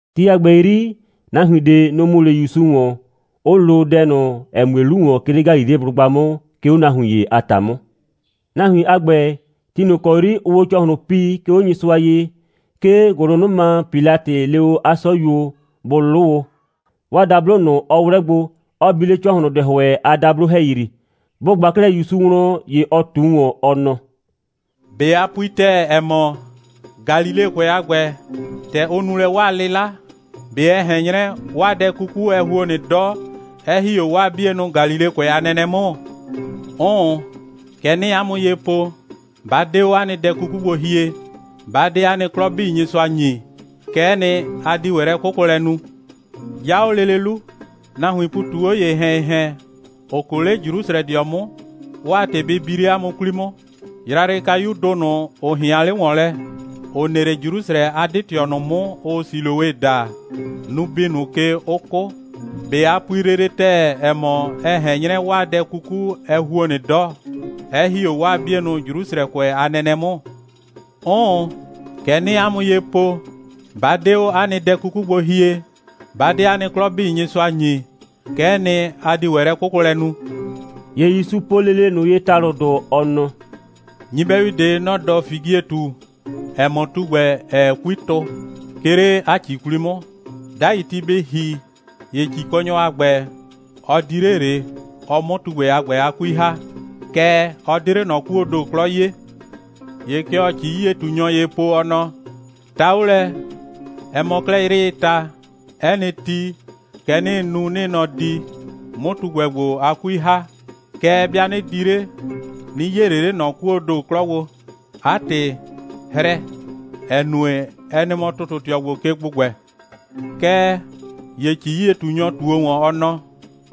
Ti a ‑gbɛ 'yri, nahuin ꞊de, nʋ‑ mu 'le ‑Yusu ‑wɔn, 'ʋ lo dɛ ꞊nʋ, ‑ɛ mue 'lu ‑wɔn, 'ke 'le Galileblʋgba 'mʋ, 'ke 'o nahuin ‑ye a ‑ta 'mʋ. Nahuin a ‑gbɛ, ti ꞊nʋ kɔ 'yri ʋʋ o 'o ‑cɔhlʋn pii, 'ke 'o Nyɩsʋa ye, 'ke ‑gʋlʋnʋma Pilatɩ le o 'a 'sɔyuo, bʋ 'lʋ o, 'waa dablo ꞊nʋ, ‑ɔ 'wlɛ gbo, 'ɔ bi 'le ‑cɔhlʋndɛhʋɛ a dablo ‑hɛyri. Bʋ ꞊gba 'klɛɛ ‑Yusu wlɔn, ‑ye ɔ ꞊tu ‑wɔn, ɔ nɔ: «꞊Be a pui ‑tɛɛ, ‑ɛ mɔ, Galilekʋɛ a ‑gbɛ, ‑tɛ ʋ nu lɛ 'waa 'lɩla, ꞊be ɛ ꞊hɛn 'nyrɛ, 'waa dɛ 'kuku, ɛ ‑huo nɩ 'dɔ, 'ɛ ‑hi 'o 'waa 'bienʋ Galilekʋɛ a nɛnɛ 'mʋ? 'Ʋʋn, kɛ 'nɩɩ 'a mʋ ye po, 'ba 'de 'o 'a nɩ dɛ 'kuku gbo hie, 'ba 'de 'a nɩ 'klɔ 'bii Nyɩsʋa ‑nyi, kɛ'ɛ nɩ, a di ‑wɛ lɛ'kʋkʋlɛ nu. 'Ya 'o lele 'lu, nahuiin ‑pu ꞊tu 'o ‑yehɛn‑yehɛn, ‑ʋ 'kʋ, 'ke 'le Jrusrɛdɩɔ 'mʋ, 'waa ‑tɩ bɩ bi 'le 'a mʋ 'kwli 'mʋ. Yrayrɩkayudʋ ꞊nʋ, ‑ʋ ꞊hɩan 'le ‑wɔn lɛ, ‑ʋ nɩ 'le Jrusrɛ a 'dɩ꞊tɩɔ ꞊nʋ 'mʋ, ʋʋ Siloe daa, nʋ‑ bi ꞊nʋ ke, 'ʋ 'kʋ. ꞊Be a pui lele ‑tɛɛ, ‑ɛ mɔ, ɛ ꞊hɛn 'nyrɛ, 'waa dɛ 'kuku, ɛ ‑huo nɩ 'dɔ, 'ɛ ‑hi 'o 'waa 'bienʋ Jrusrɛkʋɛ a nɛnɛ 'mʋ? 'Ʋʋn, kɛ 'nɩɩ 'a mʋ ye po, 'ba 'de 'o 'a nɩ dɛ 'kuku gbo hie, 'ba 'de 'a nɩ 'klɔ 'bii Nyɩsʋa ‑nyi, kɛ'ɛ nɩ, a di ‑wɛ lɛ'kʋkʋlɛ nu.» ‑Ye ‑Yusu po lele ꞊nʋ ye ‑talʋdʋ, ɔ nɔ: «Nyɩbɛyu ꞊de, nɔ‑ 'dɔ figietu, ‑ɛ mɔ, tugbɛ, ‑ɛɛ 'kui tʋ, 'ke 'le 'a ‑ci 'kwli 'mʋ. 'Dai ti bɩ ‑hi, ‑ye ‑cikɔnyɔ a ‑gbɛ, ɔ di 'le ꞊le, ɔ 'mʋ tugbɛ a ‑gbɛ a 'kui ‑ha, kɛɛ, ɔ 'de 'le ꞊nɔ 'kuoo ‑do 'klɔ 'yee. ‑Ye kɛ ɔɔ ‑ci'yie꞊tunyɔ ye po, ɔ nɔ: Ta 'o lɛ, ɛ mɔ 'klɛɛ 'yrɩɩ ta, 'ɛ nɩ ti, kɛ 'nɩɩ nu, 'nɩɩ nɔ di, 'mʋ tugbɛ ‑gbo a 'kui ‑ha. Kɛɛ, 'bɩa 'nɩ di 'le, 'nɩ 'yee ꞊le 'le ꞊nɔ 'kuoo ‑do 'klɔ gbo. 'A ‑tɩ, hrɛ! ‑Ɛ nue, ɛ nɩ mɔ ‑tʋtʋtɩɔ ‑gbo ke ‑gbʋgbɛ. Kɛɛ ‑ye ‑ci'yie꞊tunyɔ ꞊tuo ‑wɔn, ɔ nɔ: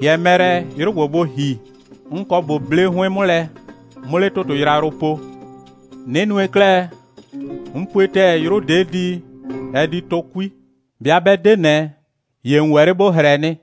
‑Hɩɛ mɛ lɛ, 'yrʋ ‑gbo bʋ ‑hi. 'N kɔ ꞊bo 'ble 'hʋɩn 'mʋ lɛ, 'mʋ 'le ‑tʋtʋ yrayrʋ po. 'Nɩ nue 'klɛɛ, 'n pue ‑tɛɛ, 'yrʋ ‑de' di, ɛ di tʋ 'kui. 'Bɩa 'bɛ 'de ꞊nɛ, ‑ye ‑n ‑wɛ 'le ‑bo hrɛ nɩ.»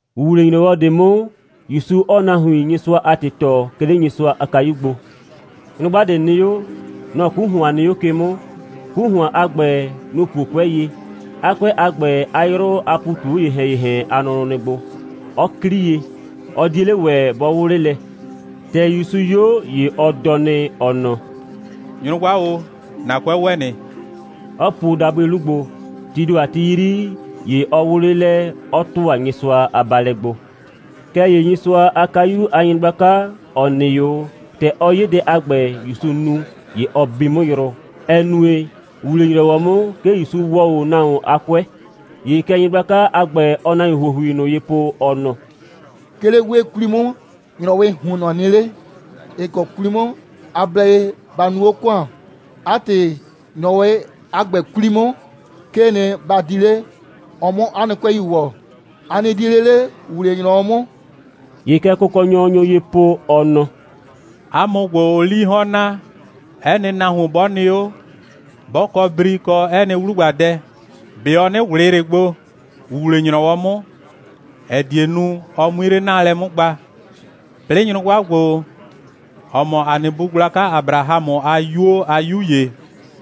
‑Wuwle‑nyrɔwɔ ꞊de 'mʋ, ‑Yusu 'ɔɔ nahuin Nyɩsʋa a ‑tɩ tɔɔ, 'ke 'le Nyɩsʋa a kayu gbo. Nyrʋgba ꞊de nɩ 'o. Nɔ‑ 'ku ‑hʋan nɩ 'o ke 'mʋ. 'Ku ‑hʋan a ‑gbɛ, nʋ‑ puo 'kʋɛ ye. 'A 'kʋɛ a ‑gbɛ, 'a 'yrʋ a ‑pu ꞊tu 'o ‑yehɛn‑yehɛn a nʋnʋ nɩ gbo. Ɔ 'klii ye. Ɔ 'die 'le ‑wɛ bɔ 'wʋ 'le lɛ. ‑Tɛ ‑Yusu 'yo, ‑ye ɔ dɔ nɩ, ɔ nɔ: «Nyrʋgba o, ‑na 'kʋɛ ‑wɛ nɩ,» 'ɔ puo dabʋɩ 'lu gbo. Tii ‑do a ti 'yri, ‑ye ɔ 'wʋ 'le lɛ, 'ɔ ‑tʋa Nyɩsʋa a baalɛ gbo. Kɛɛ ‑ye Nyɩsʋa a kayu a nyɩgblaka, ‑ɔ nɩ 'o, ‑tɛ ɔ 'ye dɛ a ‑gbɛ, ‑Yusu nu, ‑ye ɔ bi 'mʋ yrʋ, ‑ɛ nue, ‑wuwle‑nyrɔwɔ 'mʋ, 'ke ‑Yusu ‑wɔɔ 'o nahuon a 'kʋɛ. ‑Ye kɛ nyɩgblaka a ‑gbɛ, ɔɔ nahuin ‑huohui ꞊nʋ ye po, ɔ nɔ: «'Ke 'le 'wee 'kwli 'mʋ, ‑nyrɔwɩɩ ‑huonnɔ nɩ 'le, ‑ɩ kɔ 'kwli 'mʋ ‑a blɛ ye ‑ba nuu 'o ‑kʋan. 'A ‑tɩ, ‑nyrɔwɩ a ‑gbɛ 'kwli 'mʋ, 'kee nɩ, ba di 'le, ɔ 'mʋ 'a nɩ 'kʋɛi ‑wɔ. A nɩ di 'le 'le ‑wuwle‑nyrɔwɔ 'mʋ.» ‑Ye kɛ Kʋkɔnyɔ nyo ye po, ɔ nɔ: «'A mʋ ‑gbo, ‑ʋʋ 'lii 'hɔn naa. 'Ɛ nɩ nahuon 'bɔ nɩ 'o, 'bɔ kɔ bri kɔ 'ɛ nɩ 'wlugbadɛ, ꞊be ɔ 'nɩ ꞊wlɩɩ ꞊le gbo, ‑wuwle‑nyrɔwɔ 'mʋ, ‑ɛ die nu, ɔ 'mui 'le 'naalɛ 'mʋ gba? 'Plɩɩ nyrʋgba ‑gbo, ‑ɔ mɔ ‑a nɩ bu gblaka Abrahamʋ a 'yuo a 'yu ‑ye,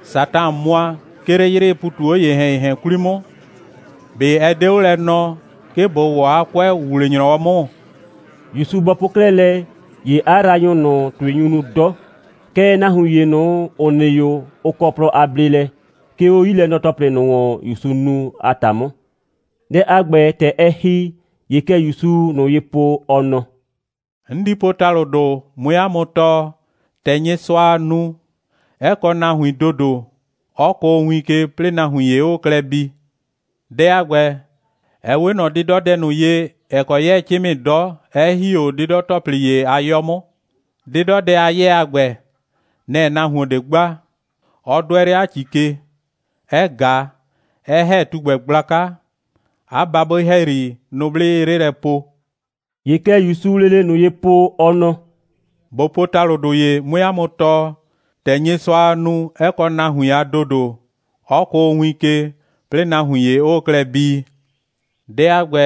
Satan mʋa, 'ke 'le 'yrɩɩ ‑pu ꞊tu 'o ‑yehɛn‑yehɛn 'kwli 'mʋ, ꞊be ɛ 'de 'o lɛ nɔɔ, 'ke ꞊bo ‑wɔ 'a 'kʋɛ ‑wuwle‑nyrɔwɔ 'mʋ?» ‑Yusu bɔ po 'klɛɛ lɛ, ‑ye 'a yraanyʋ ꞊nʋ, ‑tʋɩ nyu nu 'dɔ. Kɛɛ, nahuin ‑ye ꞊nʋ, ‑ʋ nɩ 'o, ʋ kɔ plɔ a bleelɛ, 'ke 'o 'yilɛnɔ‑tɔplɩ 'bii ꞊nʋ, ‑Yusuu nu a ‑ta 'mʋ. Dɛ a ‑gbɛ, ‑tɛ ɛ ‑hi, ‑ye kɛ ‑Yusuu ꞊nʋ ye po, ɔ nɔ: «'N di po ‑talʋdʋ, 'mue 'a mʋ tɔɔ, ‑tɛ Nyɩsʋaa nu, 'ɛ kɔ nahuin a ‑dodo, 'ɔ kʋʋ win ke, 'plɩɩ nahuin ‑ye 'ʋʋ klɛ bii. Dɛ a ‑gbɛ, ɛ 'we ꞊nɔ 'dɩdɔdɛ ꞊nʋ ye, ‑ɛ kɔ 'yɛɛ 'cɩmɩ 'dɔ, 'ɛ ‑hi 'o 'dɩdɔ‑tɔplɩ ‑ye a 'yɔ 'mʋ. 'Dɩdɔdɛ a 'yɛɛ a ‑gbɛ, nɛ‑ nahuon ꞊de gba, 'ɔ 'dʋɛ 'le 'a ‑ci ke, 'ɛ ꞊ga, 'ɛ ‑hɛ tugbɛ gblaka, 'a babʋɩ ‑hɛyri, nʋblɩ 'ɩɩ 'le 'lɛ poo.» ‑Ye kɛ ‑Yusuu lele ꞊nʋ ye po ɔ nɔ: «꞊Bo po ‑talʋdʋ ‑ye, 'mue 'a mʋ tɔɔ, ‑tɛ Nyɩsʋaa nu, 'ɛ kɔ nahuin a ‑dodo, 'ɔ kʋʋ win ke, 'plɩɩ nahuin ‑ye 'ʋʋ klɛ bii. Dɛ a ‑gbɛ,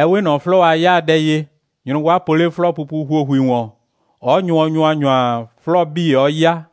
ɛ 'we ꞊nɔ 'flɔɔ a 'yaadɛ ye, nyrʋgba po 'le 'flɔɔpupu ‑huohui ‑wɔn, 'ɔ nyʋɔ ‑nyʋanyʋa, 'flɔɔ 'bii 'ɔ 'ya.»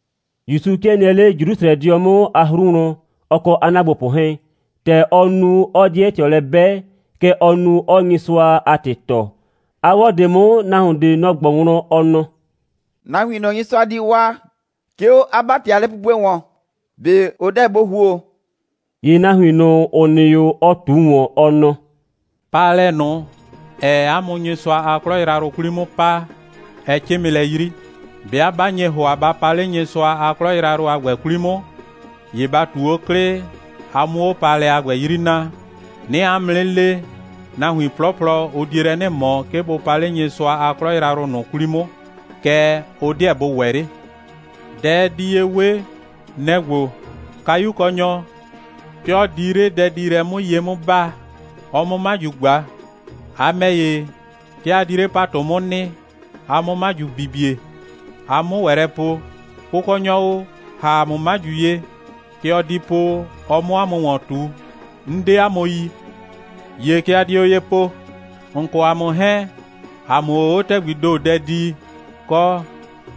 ‑Yusu 'kɩɛ nɩɛ 'le Jrusrɛdɩɔ 'mʋ a 'hru wlɔn, ɔ kɔ 'a ‑naagbopʋ 'hɛɛn. ‑Tɛ ɔɔ nu, 'ɔɔ 'dɩɛ ꞊tɩɔ lɛ 'bɛ, kɛ ɔɔ nu, 'ɔɔ Nyɩsʋa a ‑tɩ tɔɔ. A 'wɔ ꞊de 'mʋ, nahuon ꞊de, nɔ‑ ꞊gbɔ wlɔn, ɔ nɔ: «Nahuin ꞊nʋ, Nyɩsʋa di waa, 'ke 'o 'a ‑bati a lɛpupue ‑wɔn, ꞊be ʋ 'deɛ bʋ ‑huo?» ‑Ye nahuin ꞊nʋ, ‑ʋ nɩ 'o, ɔ ꞊tu ‑wɔn, ɔ nɔ: «Paalɛ ꞊nʋ, ‑ɛɛ 'a mʋ Nyɩsʋa a 'klɔ yrayrʋ 'kwli 'mʋ paa, ɛ 'cɩmɩ lɛ 'yri. 'Bɩa 'ba nye ‑hʋa, ba pa 'le Nyɩsʋa a 'klɔ yrayrʋ a ‑gbɛ 'kwli 'mʋ, ‑ye ba ꞊tu 'o 'klɩ, a 'mʋ 'o paalɛ a ‑gbɛ 'yri naa. 'Nɩɩ 'a mʋ 'nɩ le, nahuin 'plɔplɔ, ʋ die lɛ 'nɩ ꞊mɔ, 'ke bʋ pa 'le Nyɩsʋa a 'klɔ yrayrʋ ꞊nʋ 'kwli 'mʋ. Kɛɛ, ʋ 'deɛ bʋ ‑wɛ 'le. Dɛ ɛ di ye 'we, nɛ‑ ‑gbo: Kayukɔnyɔ, 'ke ɔ di 'le dɛdiilɛ 'mʋ ye 'mʋ 'baa, ɔ 'mʋ 'maju ꞊gba. A ‑mɛ ‑ye, 'ke a di 'le ‑patʋ 'mʋ nɩ, a 'mʋ 'maju bibie, a 'mʋ ‑wɛ lɛ po: Kʋkɔnyɔ o, ‑ha ‑a mʋ 'maju ye. Kɛ ɔ di po, ɔ 'mʋ 'a mʋ ‑wɔn ꞊tu: 'N 'de 'a mʋ yi. ‑Ye kɛ a dio ye po: ‑N kɔ ‑a mʋ 'hɛɛn, ‑a mʋʋ o 'o ‑tɛgbii ‑do dɛ dii, kɔ,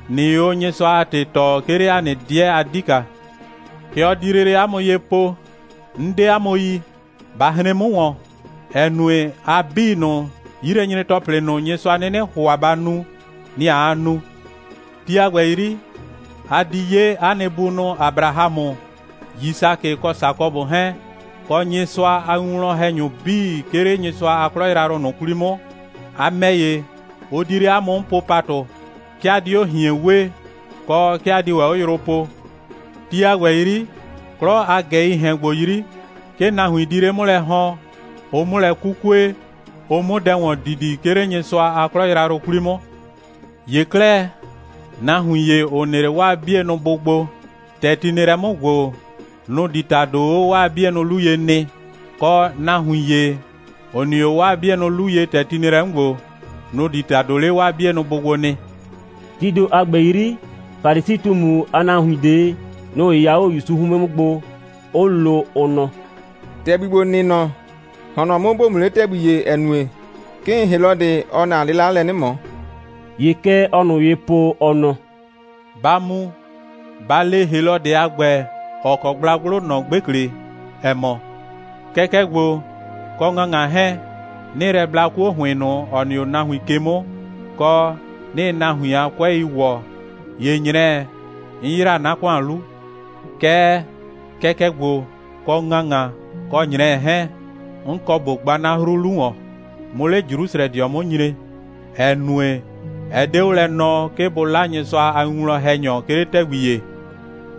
꞊nɩɩ o Nyɩsʋa a ‑tɩ tɔɔ, 'ke 'le ‑a nɩ 'dɩɛ a 'dika. Kɛ ɔ di lele 'a mʋ ye po: 'N 'de 'a mʋ yi. Ba hren 'mʋ ‑wɔn, ‑ɛ nue, a 'bii ꞊nʋ, 'yilɛnyre‑tɔplɩ ꞊nʋ, Nyɩsʋa 'nɩnɩ ‑hʋa ba nu, nɩ‑ aa nu. Ti a ‑gbɛ 'yri, a di 'ye 'a nɩ bunʋ Abrahamʋ, Yisakɩ kɔ Sakɔbʋ 'hɛɛn, kɔ Nyɩsʋa a winwlɔn‑hɛnyʋ 'bii, 'ke 'le Nyɩsʋa a 'klɔ yrayrʋ ꞊nʋ 'kwli 'mʋ. A ‑mɛ ‑ye, ʋ di 'le 'a mʋ 'mʋ po ‑patʋ. 'Ke a di 'o ꞊hien wee, kɔ, 'ke a di ‑wɛ 'o yrʋ poo. Ti a ‑gbɛ 'yri, 'klɔ a ꞊gɛii ‑hɛn ‑gbo 'yri, 'ke nahuin di 'le 'mʋ lɛ ‑hɔn, ʋ 'mʋ lɛ 'kukue, ʋ 'mʋ dɛ ‑wɔn didi, 'ke 'le Nyɩsʋa a 'klɔ yrayrʋ 'kwli 'mʋ. ‑Ye 'klɛɛ, nahuin ‑ye, ‑ʋ nɩ 'le 'waa 'bienʋ bʋ gbo, ‑tɛ ti nɩ lɛ 'mʋ ‑gbo, nʋ‑ di ‑tado 'o 'waa 'bienʋ 'lu ye nɩ, kɔ, nahuin ‑ye, ‑ʋ nɩ 'o 'waa 'bienʋ 'lu ye, ‑tɛ ti nɩ lɛ 'mʋ ‑gbo, nʋ‑ di ‑tado 'le 'waa 'bienʋ bʋ gbo nɩ.» Tii ‑do a ‑gbɛ 'yri, Falisi꞊tumu a nahuin ꞊de, nʋ‑ 'yɩya 'o ‑Yusu 'hʋɩn 'mʋ gbo, 'ʋ lo, ʋ nɔ: «‑Tɛgbi ‑gbo, ‑n nɩ mɔ, ‑hɔn nɔ 'mʋ, ‑bo mu 'le ‑tɛgbi ‑ye, ‑ɛ nue, 'kɩɩn Helɔdɩ, ɔɔ ‑na 'lɩla lɛ 'nɩ ꞊mɔ.» ‑Ye kɛ ɔɔ ꞊nʋ ye po, ɔ nɔ: «Ba mu, ba le Helɔdɩ a ‑gbɛ, ‑ɔ kɔ gblagblʋ, ‑nɔ 'gbekle, ‑ɛ mɔ: Kɛkɛ ‑gbo, kɔ ‑ŋaŋa 'hɛɛn, 'nɩɩ lɛ bla 'kuo ‑hʋɩn ꞊nʋ, ‑ɔ nɩ 'o nahuin ke 'mʋ, kɔ, 'nɩɩ nahuin a 'kʋɛi ‑wɔ, ‑ye ꞊nyrɛɛ, 'n ‑yra 'na ‑kʋan 'lu. Kɛɛ, kɛkɛ ‑gbo, kɔ ‑ŋaŋa, kɔ ꞊nyrɛɛ 'hɛɛn, 'n kɔ ꞊bo gba 'na 'hru 'lu ‑wɔn, 'mʋ 'le Jrusrɛdɩɔ 'mʋ nyre, ‑ɛ nue, ɛ 'de 'o lɛ nɔɔ, 'ke bʋ 'la Nyɩsʋa a winwlɔn‑hɛnyɔ, 'ke 'le ‑tɛgbi ‑ye,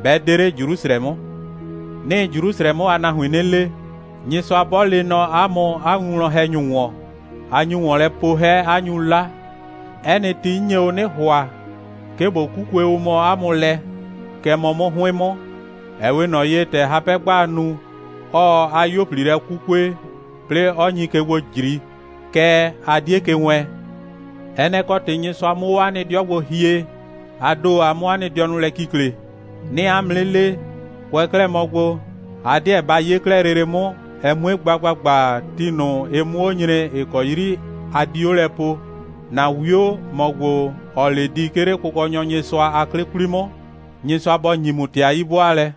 'bɛ 'de 'le Jrusrɛ 'mʋ. 'Nɩɩ Jrusrɛ 'mʋ a nahuin 'nɩ le: Nyɩsʋa 'bɔ lee nɔ 'a mʋ 'a winwlɔn‑hɛnyʋ ‑wɔn, a nyu ‑wɔn lɛ po 'hɛ, 'a nyu 'la. 'Ɛ nɩ ti, 'n nye o 'nɩ ‑hʋa, 'ke ꞊bo 'kukue o mɔ 'a mʋ lɛ, kɛ mɔ 'mʋ 'hʋɩn 'mʋ, ‑ɛ 'we ꞊nɔ ye, ‑tɛ hapɛ'gbaa nu, 'ɔɔ 'a 'yuo꞊pli lɛ 'kukue, 'plɩɩ, 'ɔ nyi ke gbo ꞊jri, kɛɛ, a 'die ke wɛɛn. Ɛ nɛ‑ kɔ ‑tɩ Nyɩsʋa 'mʋ 'o 'a nɩ 'dɩɔ gbo hie, a ‑do, a 'mʋ 'a nɩ dɩɔnʋ lɛ kikle. 'Nɩɩ 'a mʋ 'nɩ le, kʋɛ 'klɛɛ mɔ gbo, a 'deɛ ba 'ye 'klɛɛ lele 'mʋ, ɛ 'mue gba ‑gbagba, ti ꞊nʋ, ɩ 'mʋ 'o nyre, ‑ɩ kɔ 'yri a di 'o lɛ poo: ‑Na 'wio, ‑mɔ ‑gbo, ‑ɔɔ 'le di, 'ke 'le Kʋkɔnyɔ Nyɩsʋa a 'dʋ 'kwli 'mʋ. Nyɩsʋa bɔ ‑nyi ‑mʋ ‑tɩ a 'yi'bʋaalɛ!»